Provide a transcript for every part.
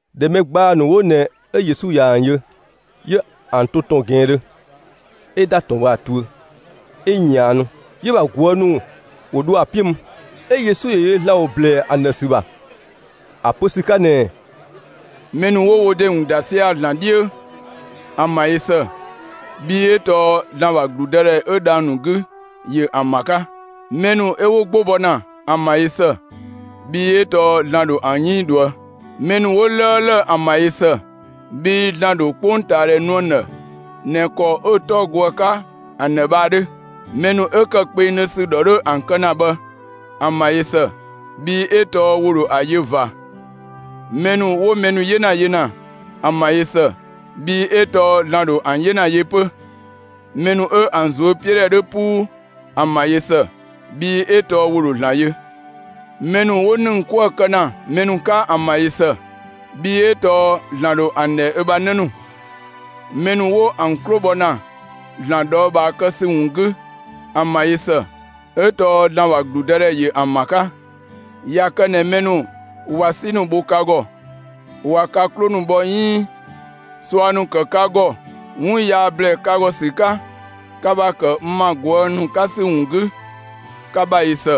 ꞊Dhɛ mɛ ‑gbaa ‑nu 'wo ꞊nɛ 'ö Yesu ꞊ya ‑an yö, 'yö ‑an to ‑tɔn ꞊gɛnngdhö, 'ö ‑da ‑tɔn bhë ‑a tuö, 'ö ꞊yaannu. 'Yö‑ ‑bha ꞊guë' ‑nu ‑wo dho ‑a 'piö mü. 'Ö Yesu ‑yö yö ‑Zlan ‑wo ‑blɛɛ ‑an ‑dhë ‑sü ‑bha ‑a pö ‑sü 'ka ꞊nɛɛ: «Mɛ ‑nu 'wo wo ‑de ‑wun ‑da sia‑ ‑Zlan 'dhiö, ‑an ‑bha ꞊yö ‑së, bhii 'ö tɔɔ ‑Zlan ‑bha ‑gludëdhɛ 'ö dhang‑ ‑nu 'gü, ‑yö ‑an ‑bha 'ka. Mɛ ‑nu 'ö 'wo 'gbo bɔ ‑na, ‑an ‑bha ꞊yö ‑së, bhii 'ö tɔɔ ‑Zlan ‑dho ‑an 'yënng ꞊dhuë'‑. Mɛ ‑nu 'wo 'lëëlë, ‑an ‑bha ꞊yö ‑së, bhii ‑Zlan ‑dho 'kpongtaadhɛ nu ‑an ‑dhë ꞊nɛ ‑kɔ 'ö‑ 'tɔ go ‑a 'ka ‑an ‑dhë bhë ‑a 'dhö. Mɛ ‑nu 'ö ‑kë kpengdhö ‑sü ‑dhɔ 'dhö ‑an kë ‑na bhë, ‑an ‑bha ꞊yö ‑së, bhii 'ö tɔɔ ‑wo ‑dho ‑a yö ꞊va. Mɛ ‑nu 'wo mɛ ‑nu 'yena yö ‑na, ‑an ‑bha ꞊yö ‑së, bhii 'ö tɔɔ ‑Zlan ‑yö ‑dho ‑an 'yena yö 'pö. Mɛ ‑nu 'ö ‑an ꞊zuöpiödhɛ 'dhö 'puu, ‑an ‑bha ꞊yö ‑së, bhii 'ö tɔɔ ‑wo ‑dho ‑Zlan yö. Mɛ ‑nu 'wo ‑nëng 'kuë‑ kë ‑na mɛ ‑nu 'ka, ‑an ‑bha ꞊yö ‑së, bhii 'ö tɔɔ ‑Zlan ‑dho ‑an ‑dhɛ ö bha 'në ‑nu. Mɛ ‑nu 'wo ‑an 'klo bhɔ ‑na ‑Zlan ꞊dhɔɔbhaa kë ‑sü ‑wun 'gü, ‑an ‑bha ꞊yö ‑së, 'ö tɔɔ ‑Zlan ‑bha ‑gludëdhɛ ‑yö ‑an ‑bha 'ka. ꞊Ya kë ꞊nɛ mɛ ‑nu ꞊wa 'si ‑nu bho ka ‑gɔ, ꞊wa ka 'klo ‑nu bhɔ 'iin ꞊sua ‑nu kë ka ‑gɔ 'wun yaa ‑blɛɛ ka ‑gɔ ‑sü 'ka, ka ‑bha ‑kë n bha ꞊guë' ‑nu 'ka ‑sü ‑wun 'gü, ka ‑bha ꞊yö ‑së,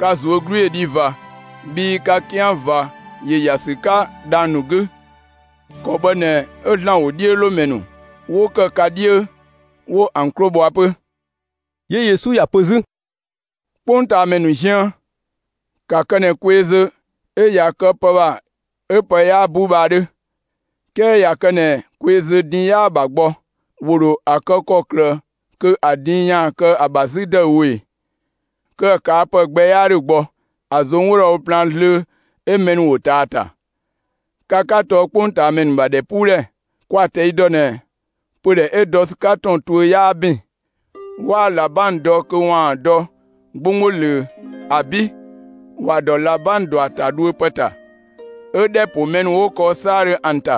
ka ꞊zuö' 'glu ‑yö dhi ꞊va, bhii ka 'kian ꞊va ‑yö ‑ya ‑sü 'ka dhang‑ ‑nu 'gü. ‑Kɔ bhë ꞊nɛ 'ö ‑Zlan ‑wodhiölomɛ ‑nu 'wo ‑kë ka 'dhiö, 'wo ‑an 'klo bhɔa 'pö.» 'Yö Yesu ‑ya pö 'zü: «'Kpongtaamɛ ‑nu ziën, ka ‑kë ꞊nɛ kweezö 'ö ꞊ya kë pë ‑bha 'ö pë 'yaa bu bhë ‑a 'dhö. 'Kɛɛ ꞊ya kë ꞊nɛ kweezö din 'yaa‑ ‑bha gbɔ, ‑wo ‑dho ‑a ‑kɔklë kö ‑a din ‑yaan kë ‑a ‑bha 'zü ‑dëüwo ꞊e? Kö ‑a ꞊kaa' ‑pë gbɛ 'yaa ‑dhö gbɔ, ‑a ꞊zong' 'wo dho ‑a wo plaan zlöö, 'ö mɛ ‑nu ‑wo ꞊taa ‑a ‑ta. Ka 'ka tɔɔ 'kpongtaamɛ ‑nu ‑bha ‑dhɛpuudhɛ. Kwa‑ ꞊tɛi' dɔ ꞊nɛ pödhɛ 'ö dɔ ‑sü 'ka ‑tɔn tuö 'yaa ‑bin. 'Waa ꞊labang dɔ kö ‑waan dɔ 'gbonggbo ꞊löö. ‑Abi', ‑wa ‑dɔ ꞊labang ‑dɔ ‑a ‑ta dhuö ‑pë ‑ta, 'ö ‑dhɛ ‑po mɛ ‑nu 'wo kɔɔ 'saadhö ‑an ‑ta.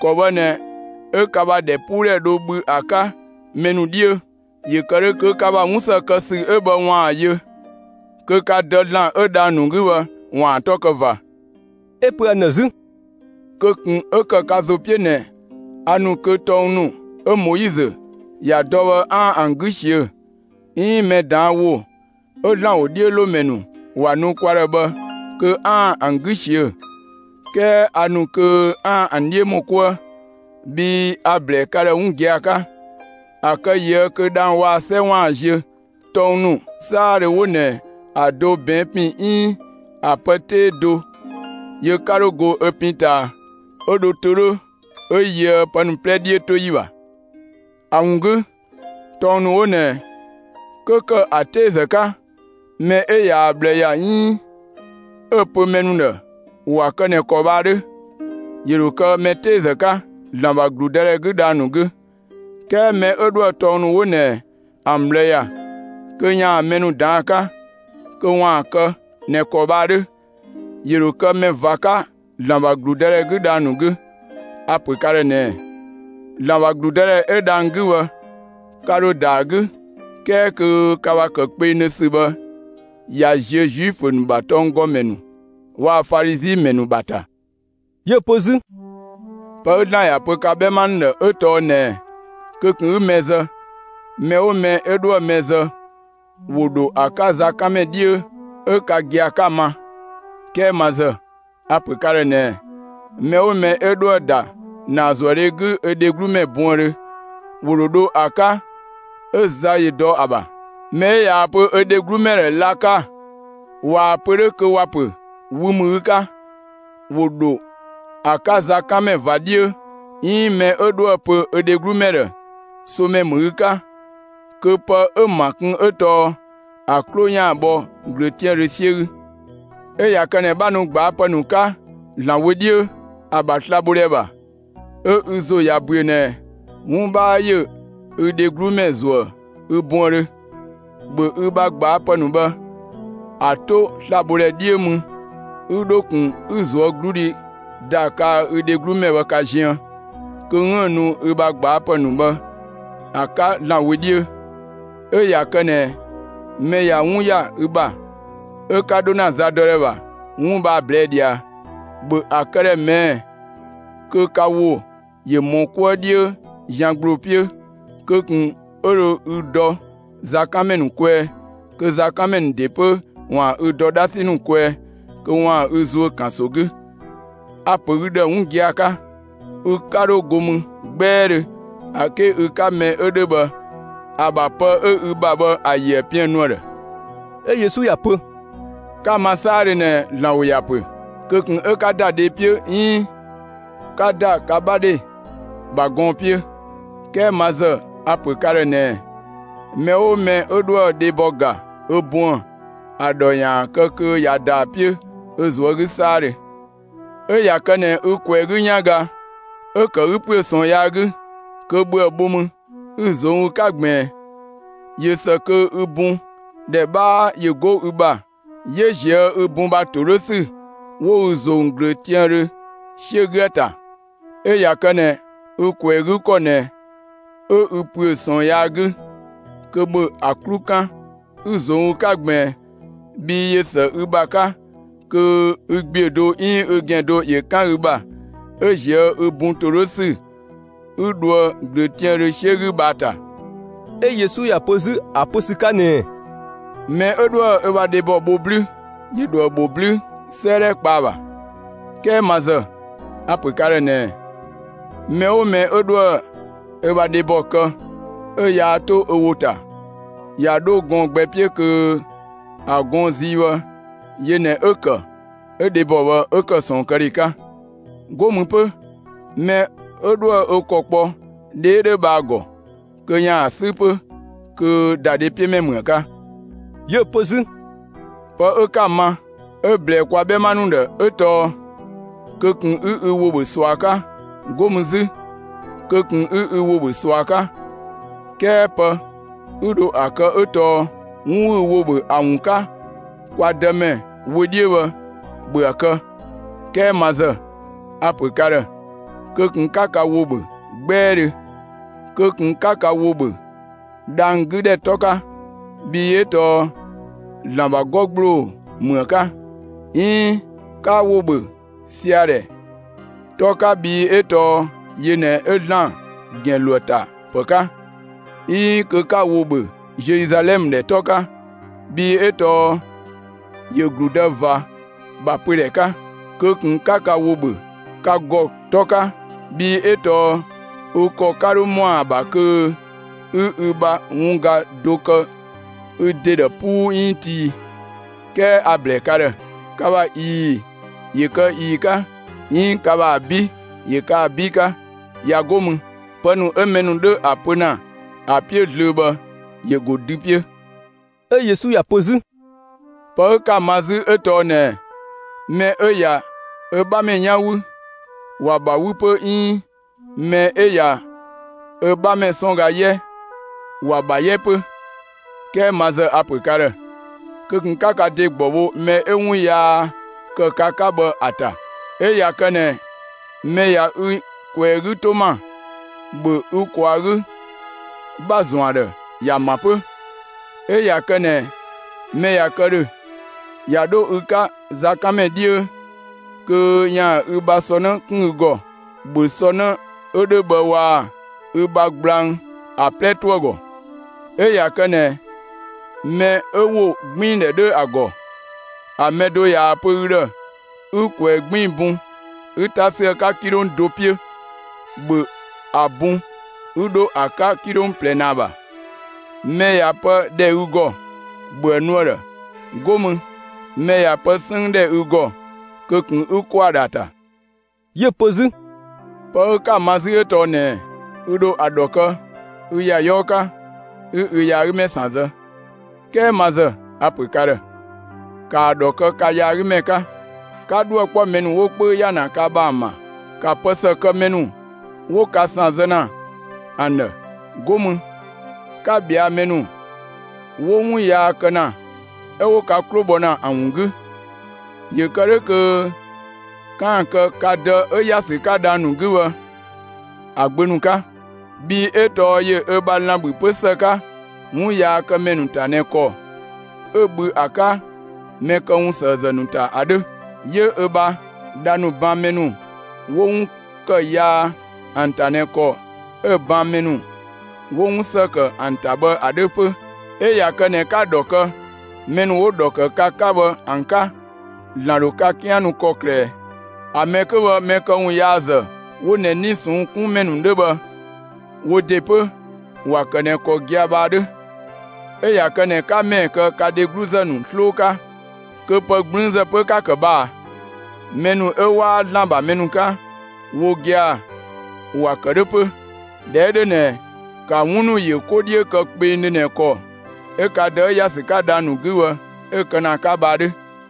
‑Kɔ bhë ꞊nɛ 'ö ka ‑bha ‑dhɛpuudhɛ dho bhü ‑a 'ka mɛ ‑nu 'dhiö. ‑Yö kë 'dhö, kö ka ‑bha 'wun ‑së kë ‑sü 'ö bhë ‑waan ‑a yö, kö ka Dë ‑Zlan 'ö dhang‑ ‑nu 'gü bhë ‑waan ‑a 'tɔ kë ꞊va.» 'Ö‑ pö ‑an ‑dhë 'zü: «Kö ꞊kun 'ö ‑kë ka ‑zo 'piö ꞊nɛ, a ‑nu kö tɔng ‑nu 'ö Moizö ‑ya dɔ bhë 'aan‑ ‑a 'gü ꞊siö'‑, 'iin mɛ ꞊daan' ‑wo 'ö ‑Zlan ‑wodhiölomɛ ‑nu ‑wa nu kwa ‑dhë bhë kö 'aan‑ ‑an 'gü ꞊siö'‑, 'kɛɛ a ‑nu kö 'aan‑ ‑an 'dhiö ‑mɔ 'kuë. Bhii a‑ ‑blɛɛ ka ‑dhë giagia 'ka, ‑a kë ꞊yië' kö dhang‑ waa‑ 'sɛ ‑waan ziö, tɔng ‑nu 'saadhö 'wo ꞊nɛ ‑a do ꞊bɛɛn' ‑pin 'iin ‑a pë 'tee do ‑yö 'ka 'dho go ö pin ꞊taa, 'ö dhö to 'dhö 'ö yöë pë ‑nu 'plɛ 'dhiötoyi ‑bha. ‑A ‑wun 'gü, tɔng ‑nu 'wo ꞊nɛ, 'kö ‑kë ‑a 'teezë 'ka, mɛ 'ö yaa‑ ꞊bhlë ‑ya 'iin 'ö‑ pö mɛ ‑nu ‑dhë ‑wa kë ꞊nɛ ‑kɔ bhë ‑a 'dhö, ‑yö ‑dho kë mɛ 'teezë 'ka, ‑Zlan ‑bha ‑gludëdhɛ 'gü dhang‑ ‑nu 'gü. 'Kɛɛ mɛ 'ö 'dhoë‑ tɔng ‑nu 'wo ꞊nɛ ‑an ꞊bhlë ‑ya, kö ‑yaan mɛ ‑nu ‑daan ‑a 'ka, kö ‑waan ‑a kë ꞊nɛ ‑kɔ bhë ‑a 'dhö, ‑yö ‑dho kë mɛ ꞊va 'ka ‑Zlan ‑bha ‑gludëdhɛ 'gü dhang‑ ‑nu 'gü. A‑ ‑pö ka ‑dhë ꞊nɛɛ: ‑Zlan ‑bha ‑gludëdhɛ 'ö dhang‑ 'gü bhë, ka ‑dho ‑da ‑a 'gü, 'kɛɛ kö ka ‑bha ‑kë kpengdhö ‑sü bhë ꞊ya ziö Zuifö ‑nu ‑bha tɔnggɔmɛ ‑nu waa‑ Falizi ‑mɛ ‑nu ‑bha ‑ta.» 'Yö‑ pö 'zü: «Pë 'ö ‑Zlan ‑ya pö ka 'bhɛma ‑nu ‑dhë 'ö tɔɔ ꞊nɛɛ: Kö ꞊kun 'ü mɛ zë; mɛ 'oo mɛ 'ö 'dhoë‑ mɛ zë, ‑wo ‑dho ‑a 'ka zakanmɛ 'dhiö 'ö ka gia‑ 'ka‑ ma. 'Kɛɛ ma ‑zë, a‑ ‑pö ka ‑dhë ꞊nɛɛ: Mɛ 'oo mɛ 'ö 'dhoë‑ ‑da ‑naazuëdhe 'gü ö dheglu ‑mɛ buëndhö, ‑wo ‑dho dho ‑a 'ka 'ö za ‑yö dɔ ‑a ‑bha. Mɛ 'ö ꞊yaa‑ pö ö dheglu ‑mɛ ‑dhë: ‹Laka!› (꞊Waa‑ pö 'dhö kö ‑wa ‑pö: Wü ‑mü ü 'ka), ‑wo ‑dho ‑a 'ka zakanmɛ ꞊va 'dhiö, 'iin mɛ 'ö 'dhoë‑ pö ö dheglu ‑dhë: ‹Somɛ ‑mü ü 'ka›, kö pë 'ö‑ ‑ma kun 'ö tɔɔ ‑a 'klo ‑yaan bhɔ ꞊glöötiaandhö 'siö 'gü. 'Ö ꞊ya kë ꞊nɛ 'bha nu gbaapë ‑nu 'ka ‑Zlan wö 'dhiö, ‑a ‑bha slabhodhɛ ‑bha, 'ö ü ‑zo ꞊ya ‑büö ꞊nɛ 'wun 'bhaa ‑yö ü dheglumɛ ‑zuëë ü buëndhö, ‑bhö ü ‑bha gbaapë ‑nu bhë, ‑an 'to slabhodhɛ 'dhiö mü 'ü 'dho ꞊kun 'ü ꞊zuögludhi ‑da kaa‑ ü dheglu ‑mɛ bhë ka ziën, kö 'üën‑ nu ü bha gbaapë ‑nu bhë ‑a 'ka ‑Zlan wö 'dhiö. 'Ö ꞊ya kë ꞊nɛ mɛ ꞊ya 'wun ‑ya ü ‑bha, 'ö 'ka 'dho ‑na zadɔdhɛ ‑bha 'wun bhë ‑a ꞊blɛɛ' ꞊dhia, ‑bhö ‑a këdhɛ ꞊mɛɛ'‑ kö ka ‑wo ‑yö ‑mɔ 'kuë 'dhiö zian ‑gbloo 'piö, kö ꞊kun 'ö dho ü dɔ zakanmɛ ‑nu kwɛɛ, kö zakanmɛ ‑nu ‑de 'pö ‑waan ü ‑dɔ 'dhasi ‑nu kwɛɛ, kö ‑waan ü ‑zuö ‑kanso 'gü. A‑ ‑pö ü ‑dhë 'wun gia‑ 'ka: Ü 'ka 'dho go mü 'gbɛɛdhö, ‑a 'ke ü 'ka mɛ 'ö 'dhö bhë ‑a ‑bha pë 'ö ü ‑bha bhë ‑a ‑yöë piën‑ nu ‑a ‑dhë.» 'Ö Yesu ‑ya pö: «'Ka‑ ma 'saadhö ꞊nɛ ‑Zlan ‑wo ‑ya pö: Kö ꞊kun 'ö 'ka ‑da dhe 'piö 'iin 'ka ‑da ka 'bha dhe ‑bha gɔɔn‑ 'piö, 'kɛɛ ma ‑zë a‑ pö ka ‑dhë ꞊nɛɛ: Mɛ 'oo mɛ 'ö 'dhoë‑ dhebɔ ‑ga ö buën‑ ‑a ‑dhɔ ‑yaan ‑a kë kö ꞊ya ‑da ‑a 'piö ö ꞊zuö' 'gü 'saadhö. 'Ö ꞊ya kë ꞊nɛ ü ꞊kwɛɛ‑ 'gü 'yanga 'ö‑ ‑kë ü ‑püö ꞊sɔɔn yaa 'gü, kö ‑bhö ‑a bho mü 'ü‑ ꞊zong' ü 'ka ꞊gbiin! ꞊Yö ‑së kö ü bun ‑dhɛ 'bhaa ‑yö 'go ü ‑bha 'yö ꞊zië' ü bun ‑bha ‑to 'dhö ‑sü 'wo ü ꞊zong' ꞊glöötiaandhö 'siö 'gü ‑a ‑ta. 'Ö ꞊ya kë ꞊nɛ ü ꞊kwɛɛ‑ 'gü ‑kɔ ꞊nɛ 'ö ü ‑püö ꞊sɔɔn yaa 'gü, kö ‑bhö ‑a 'klu 'kan 'ü‑ ꞊zong' ü 'ka ꞊gbiin! Bhii ꞊yö ‑së ü ‑bha 'ka kö ü ‑gbiö do 'iin ü ‑gɛn do ‑yö 'kan ü ‑bha, 'ö ꞊zië' ü bun ‑to 'dhö ‑sü 'ü dhoë ꞊glöötiaandhö 'siö 'gü bhë ‑a ‑ta.» 'Ö Yesu ‑ya pö 'zü ‑a pö ‑sü 'ka ꞊nɛɛ: «Mɛ 'ö 'dhoë‑ ö bha dhebɔ bho 'blü, ‑yö ‑dho ‑a ‑bho 'blü 'sëëdhɛ kpa ‑a ‑bha. 'Kɛɛ ma ‑zë, a‑ ‑pö ka ‑dhë ꞊nɛɛ: Mɛ 'oo mɛ 'ö 'dhoë‑ ö bha dhebɔ kë, 'ö yaa 'to ö ‑wo ‑ta, ꞊ya 'dho gɔɔn‑ gbɛ 'piö kö ‑a gɔɔn‑ zii bhë yö ꞊nɛ 'ö‑ ‑kë 'ö dhebɔ bhë 'ö ‑kë ꞊sɔɔnkëdhe 'ka. 'Go mü 'pö, mɛ 'ö 'dhoë‑ ö ‑kɔ kpɔ dhe 'ö 'dhö bhë ‑a ‑gɔ kö ‑yaan ‑a 'sü 'pö, kö ‑dadhepiömɛ ‑mü ‑a 'ka.» 'Yö‑ pö 'zü: «Pë 'ö 'ka‑ ma, 'ö‑ ꞊blɛɛ kwa 'bhɛma ‑nu ‑dhë 'ö tɔɔ: Kö ꞊kun 'ü ü ‑wo ‑bhö ꞊sua 'ka, 'go mü 'zü: Kö ꞊kun 'ü ‑wo ‑bhö ꞊sua 'ka; 'kɛɛ pë 'ü dho ‑a kë 'ö tɔɔ 'wun 'ü ü ‑wo ‑bhö ‑a ‑wun 'ka kwa Dëmɛ wö 'dhiö bhë, ‑bhö ‑a kë! 'Kɛɛ ma ‑zë, a‑ ‑pö ka ‑dhë: Kö ꞊kun 'ka ka ‑wo ‑bhö 'gbɛɛdhö! Kö ꞊kun 'ka ka ‑wo ‑bhö dhang‑ 'gü ‑dhɛ 'tɔ 'ka! Bhii 'ö tɔɔ ‑Zlan ‑bha 'gɔ ‑gbloo ‑mü ‑a 'ka. 'Iin 'ka ‑wo ‑bhö sia‑ ‑dhɛ 'tɔ 'ka bhii 'ö tɔɔ yö ꞊nɛ 'ö ‑Zlan ‑gɛn ‑lo ‑a ‑ta ‑pë 'ka. 'Iin kö 'ka ‑wo ‑bhö Zeluzalɛmë ‑dhɛ 'tɔ 'ka, bhii 'ö tɔɔ ‑yö ‑gludë ꞊va ‑bha pödhɛ 'ka. Kö ꞊kun 'ka ka ‑wo ‑bhö ka ‑gɔ 'tɔ 'ka, bhii 'ö tɔɔ ü ‑kɔ 'ka 'dho ‑mɔ ‑a ‑bha kö 'ü ü ‑bha wun ga do kë ü ‑de ‑dhë 'puu 'iin tii. 'Kɛɛ a‑ ‑blɛɛ ka ‑dhë: Ka ‑bha ꞊ii‑ ‑yö kë ꞊ii‑ 'ka, 'iin ka ‑bha ‑abi' ‑yö kë ‑abi' 'ka. ꞊Ya 'go mü, pë ‑nu 'ö mɛ ‑nu 'dho ‑a pö ‑na ‑a 'piö zlöö bhë ‑yö ‑go dü 'piö.» 'Ö Yesu ‑ya pö 'zü: «Pë 'ö 'ka‑ ma 'zü 'ö tɔɔ ꞊nɛɛ: Mɛ 'ö ꞊ya ö 'bhamɛ 'yan wü, ‑wa ‑bha 'wü 'pö 'iin mɛ 'ö ꞊ya ö 'bhamɛ 'sɔn ga 'yɛ, ‑wa ‑bha 'yɛ 'pö. 'Kɛɛ ma ‑zë a‑ ‑pö ka ‑dhë: Kö ꞊kun 'ka ka ‑de ‑gbɔ bho mɛ 'ö 'wun yaa ‑kë ka 'ka bhë ‑a ‑ta! 'Ö ꞊ya kë ꞊nɛ mɛ ꞊ya ü ꞊kwɛɛ‑ 'gü 'to ‑ma, ‑bhö ü ꞊kwaa‑ 'gü ‑bha ‑zɔn ‑a ‑dhë ‑ya ‑a ‑ma 'pö! 'Ö ꞊ya kë ꞊nɛ mɛ ꞊ya kë ‑dhö ꞊ya 'dho ü 'ka zakanmɛ 'dhiö kö ‑yaan ü bha sɔ 'në 'kun ü ‑gɔ, ‑bhö sɔ 'në 'ö 'dhö waa‑ ü bha gblang ‑a 'plɛ 'to ‑a ‑gɔ! 'Ö ꞊ya kë ꞊nɛ mɛ 'ö ‑wogbiindhɛ 'dhö ‑a ‑gɔ, ‑a mɛ do ꞊yaa‑ pö ü ‑dhë 'ü ꞊kwɛɛ‑ 'gbiin‑ bun 'ü 'ta 'sü ‑a 'ka 'kilong do 'piö, ‑bhö ‑a bun 'ü 'dho ‑a 'ka 'kilong ꞊plɛ ‑naa ‑bha! Mɛ ꞊ya pë ‑dhɛ ü ‑gɔ, ‑bhö ‑a nu ‑a ‑dhë! 'Go mü, mɛ ꞊ya pë 'sënng ‑dhɛ ü ‑gɔ, kö ꞊kun 'ü ‑kɔ ‑a ‑dhë ‑a ‑ta!» 'Yö‑ pö 'zü: «Pë 'ö 'ka‑ ma 'zü 'ö tɔɔ ꞊nɛɛ: Ü ‑dho ‑a ‑dhɔ kë ü ‑ya 'yɔɔ 'ka, 'ü ü yaagümɛ ‑san zë, 'kɛɛ ma ‑zë, a‑ ‑pö ka ‑dhë: ‑Kaa ‑dhɔ kë ka yaagümɛ 'ka, ['ka 'dhuë‑ 'kpɔ mɛ ‑nu 'wo 'kpöü ‑ya ka ‑bha ‑an ‑bha! ‑Ka pë ‑së kë mɛ ‑nu 'wo ka ‑san zë ‑na ‑an ‑dhë!] 'Go mü 'ka ꞊bhɛa' mɛ ‑nu ['wo 'wun yaa kë ‑na 'ö] 'wo ka 'klo bhɔ ‑na ‑an ‑wun 'gü! ‑Yö kë 'dhö kö 'kaan‑ kë ka Dë 'ö ‑ya ‑sü 'ka dhang‑ ‑nu 'gü bhë ‑a gbö ‑nu 'ka. Bhii 'ö tɔɔ ‑yö ö bha lan‑ ‑bhü 'pö ‑së 'ka, 'wunyaakëmɛ ‑nu ‑ta ꞊nɛ ‑kɔ 'ö‑ bhü ‑a 'ka mɛ këwunsëëzë ‑nu ‑ta ‑a 'dhö. 'Yö ö bha dha ‑nu ban mɛ ‑nu 'wo 'wun ‑kë yaa ‑an ‑ta ꞊nɛ ‑kɔ 'ö‑ ban mɛ ‑nu 'wo 'wun ‑së ‑kë ‑an ‑ta bhë ‑a 'dhö 'pö. 'Ö ꞊ya kë ꞊nɛ 'ka‑ ‑dhɔ kë mɛ ‑nu 'wo‑ ‑dhɔ ‑kë ka 'ka bhë ‑an 'ka, ‑Zlan ‑dho ka 'kian nu ‑kɔklë ꞊ɛ? ‑A mɛ 'kö bhë, mɛ këwun yaazë 'wo ꞊nɛ 'nii‑ ꞊sɔnng' 'kun ‑mɛ ‑nu 'dhö bhë, wo ‑de 'pö, ‑wa ‑kë ꞊nɛ ‑kɔ gia‑ bhë ‑a 'dhö. 'Ö ꞊ya kë ꞊nɛ 'ka ‑mɛɛ kë ka dhegluzë ‑nu 'sloo 'ka, kö pë 'gblüünzë 'pö 'ka‑ ‑kë bhë ꞊a? Mɛ ‑nu 'ö 'waa ‑Zlan ‑bha mɛ ‑nu 'ka, wo gia‑ ‑wa ‑kë 'dhö 'pö! ꞊Dhɛ 'ö 'dhö ꞊nɛ, ‑ka 'wun ‑nu yö 'ko 'dhiö kpengdhö ꞊nɛ ‑kɔ 'ö ka Dë 'ö ‑ya ‑sü 'ka dhang‑ ‑nu 'gü bhë 'ö‑ kë ‑na ‑a 'ka bhë ‑a 'dhö.»